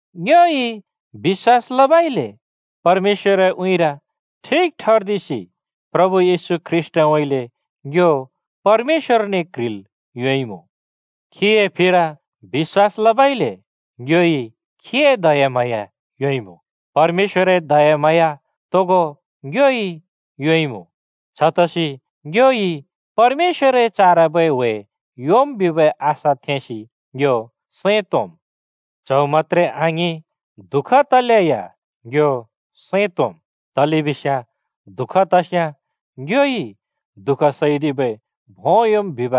ङ्योइ बिश्‍वास लबइले परमेश्‍वरए उँइँरि ठिक ठर्दिसि प्रभु येशू ख्रीष्‍टउँइँले ङ्यो परमेश्‍वरने क्ह्रिल् योंइमुँ। खीए फिर बिश्‍वास लबइले ङ्योइ खीए दयाम्हाँया योंइमुँ। परमेश्‍वरए दयाम्हाँया तोगो ङ्योइ योंइमुँ, छतसि ङ्योइ परमेश्‍वरए चारबै ह्‍वे योंम् बिबै आशा थेंसि ङ्यो सैं तोंम्। च्‍हौ मत्‍त्रे आङिं, दुःख तलेया ङ्यो सैं तोंम्, तलेबिस्याँ दुःख तस्‍याँ ङ्योइ दुःख सैदिबै भों योंम् बिब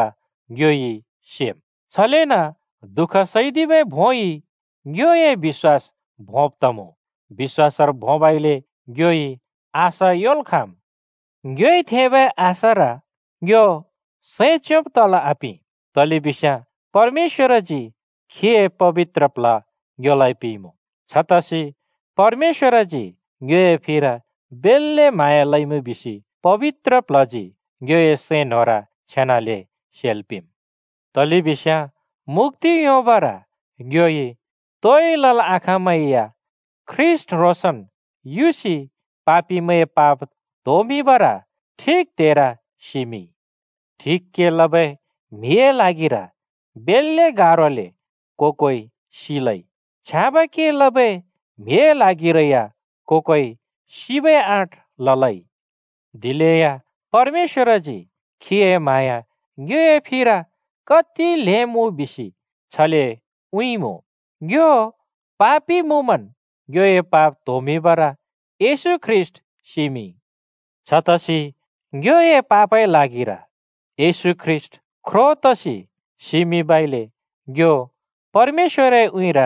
ङ्योइ सेम्। छलेन दुःख सैदिबै भोंइ ङ्योए बिश्‍वास भोंब तमुँ, बिश्‍वासर भोंबइले ङ्योइ आशा योंल् खाँम्। ङ्योइ थेंबै आशार ङ्यो सैं च्योंब तल् आपिं, तलेबिस्याँ परमेश्‍वरजी खीए पबित्र प्ल्ह ङ्योलाइ पिंइमुँ, छतसि परमेश्‍वरजी ङ्योए फिर बेल्‍ले म्हाँया लइमुँ बिसि पबित्र प्ल्हजी ङ्योए सैं न्‍होंर छेनाले सेल् पिंम्। तलेबिस्याँ मुक्‍ति योंबर ङ्योइ तोइ लल् आखाँमै या ख्रीष्‍ट ह्रोंसन् युसि पापिमैंए पाप त्होमिंबर ठिक त्हेर सिमिंइ। ठिक के लबै म्‍हिए ल्हागिर बेल्‍ले गारोले को-कोइ सिलै, छ्याँबै के लबै म्‍हिए ल्हागिरै या को-कोइ सिबै आँट ललै। दिलेया परमेश्‍वरजी खीए म्हाँया ङ्योए फिर कति ल्हें मुँ बिसि छले उँइँइँमुँ, ङ्यो पापि मुँमन् ङ्योए पाप त्होमिंबर येशू ख्रीष्‍ट सिमिंइ! छतसि ङ्योए पापए ल्हागिर येशू ख्रो तसि सिमिंबइले ङ्यो परमेश्‍वरए उँइँर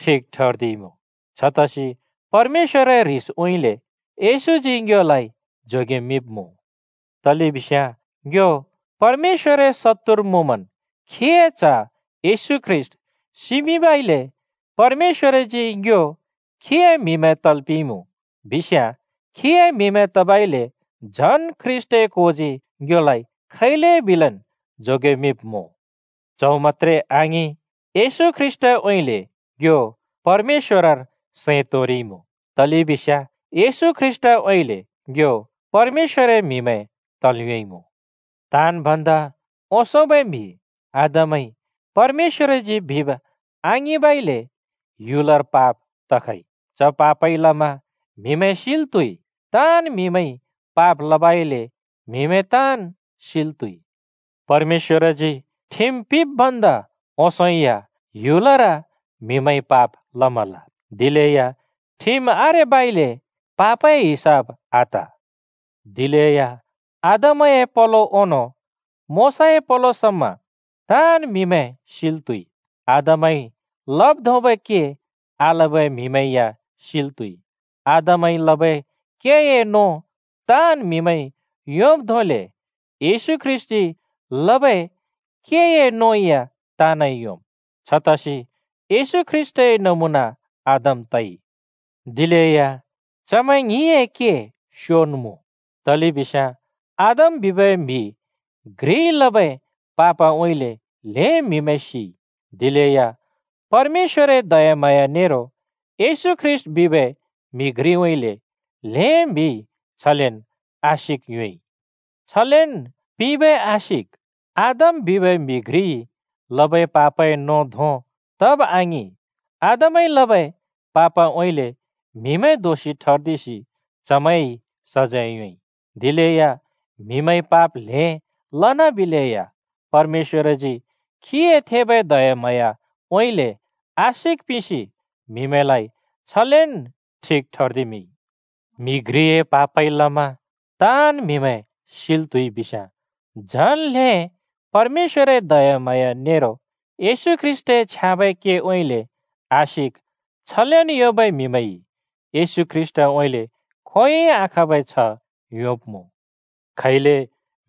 ठिक ठर्दिइमुँ। छतसि परमेश्‍वरए ह्रिसउँइँले येशूजी ङ्योलाइ जोगेमिंब्मुँ। तलेबिस्याँ ङ्यो परमेश्‍वरए शत्तुर मुँमन् खीए च्‍ह येशू ख्रीष्‍ट सिमिंबइले परमेश्‍वरजी ङ्यो खीए म्हिमैं तल् पिंइमुँ बिस्याँ, खीए म्हिमैं तबइले झन् ख्रीष्‍टए कोजी ङ्योलाइ खैलेबिलेन् जोगेमिंब्मुँ। च्‍हौ मत्‍त्रे आङिं, येशू ख्रीष्‍टउँइँले ङ्यो परमेश्‍वरर सैं तोंरिइमुँ, तलेबिस्याँ येशू ख्रीष्‍टउँइँले ङ्यो परमेश्‍वरए म्हिमैं तल् योंइमुँ। ताँन् भन्दा ओंसोंबै म्‍हि आदमइ परमेश्‍वरजी बिब् आङिंबइले ह्‍युलर पाप तखइ, च पापइ लमा म्हिमैं सिल् त्‍हुइ। ताँन् म्‍हिमैंइ पाप लबइले म्‍हिमैं ताँन् सिल् त्हुइ। परमेश्‍वरजी ठिम पिंब् भन्दा ओंसों या ह्‍युलर म्‍हिमैंइ पाप लमल, दिलेया ठिम आरेबइले पापए हिसाब आत। दिलेया आदमए पलो ओंनों मोशाए पलो समा ताँन् म्‍हिमैं सिल् त्‍हुइ। आदमइ लब् धोंबै के आलबै म्हिमैं या सिल् त्हुइ। आदमइ लबै केए नों ताँन् म्‍हिमैंइ योंब् धोंले येशू ख्रीष्‍टजी लबै केए नों या ताँनइ योंम्। छतसि येशू ख्रीष्‍टए नमुना आदम तइ। दिलेया चमैं ङ्हिंए के स्योन् मुँ: तलेबिस्याँ आदम बिबै म्‍हि घ्रिइ लबै पापउँइँले ल्हें म्‍हिमैं सिइ। दिलेया परमेश्‍वरए दयाम्हाँया नेरो येशू ख्रीष्‍ट बिबै म्‍हि घ्रिउँइँले ल्हें म्हिइ छलेन् आशिक योंइ। छलेन् पिंबै आशिक आदम बिबै म्हि घ्रिइ लबै पापए नों धों तब आङिं। आदमइ लबै पापउँइँले म्‍हिमैं दोषि ठर्दिसि चमैंइ सजैं योंइ। दिलेया म्‍हिमैंइ पाप ल्हें लनाबिलेया परमेश्‍वरजी खीए थेबै दयाम्हाँयाउँइँले आशिक पिंसि म्‍हिमैंलाइ छलेन् ठिक ठर्दिमिंइ। म्‍हि घ्रिए पापइ लमा ताँन् म्‍हिमैं सिल त्हुइ बिस्याँ, झन ल्हें परमेश्‍वरए दयाम्हाँया नेरो येशू ख्रीष्‍टए छ्याँबै केउँइँले आशिक छलेन् योंबै म्हिमैंइ येशू ख्रीष्‍टउँइँले खोंयोंइ आखाँबै छ्ह योंब्‍मुँ। खैले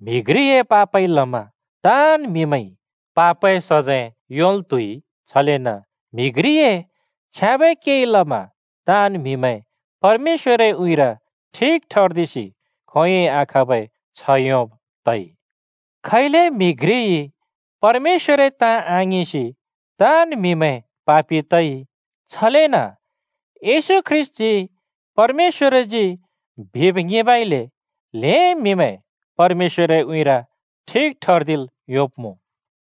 म्हि घ्रिए पापइ लमा ताँन् म्हिमैंइ पापए सजैं योंल् त्‍हुइ, छलेन म्हि घ्रिए छ्याँबै केइ लमा ताँन् म्‍हिमैं परमेश्‍वरए उँइँर ठिक ठर्दिसि खोंयोंइ आखाँबै छ्ह योंब् तइ। खैले म्हि घ्रिइ परमेश्‍वरए ताँ आङिंसि ताँन् म्‍हिमैं पापि तइ, छलेन येशू ख्रीष्‍टजी परमेश्‍वरजी बिब् ङिंबइले ल्हें म्‍हिमैं परमेश्‍वरए उँइँरि ठिक ठर्दिल् योंब्‍मुँ।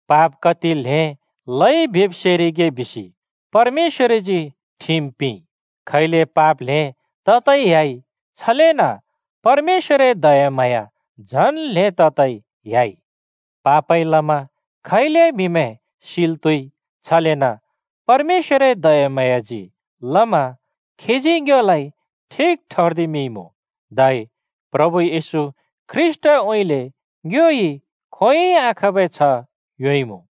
पाप कति ल्हें लइ बिब् सेरिगे बिसि परमेश्‍वरजी ठिम पिंइ। खैले पाप ल्हें ततै ह्‍याइ, छलेन परमेश्‍वरए दयाम्हाँया झन् ल्हें ततै ह्‍याइ। पापइ लमा खैले म्हिमैं सिल् त्हुइ, छलेन परमेश्‍वरए दयाम्हाँयाजी लमा खीजी ङ्योलाइ ठिक ठर्दिमिंइमुँ, धै प्रभु येशू ख्रीष्‍टउँइँले ङ्योइ खोंयोंइ आखाँबै छ्ह योंइमुँ।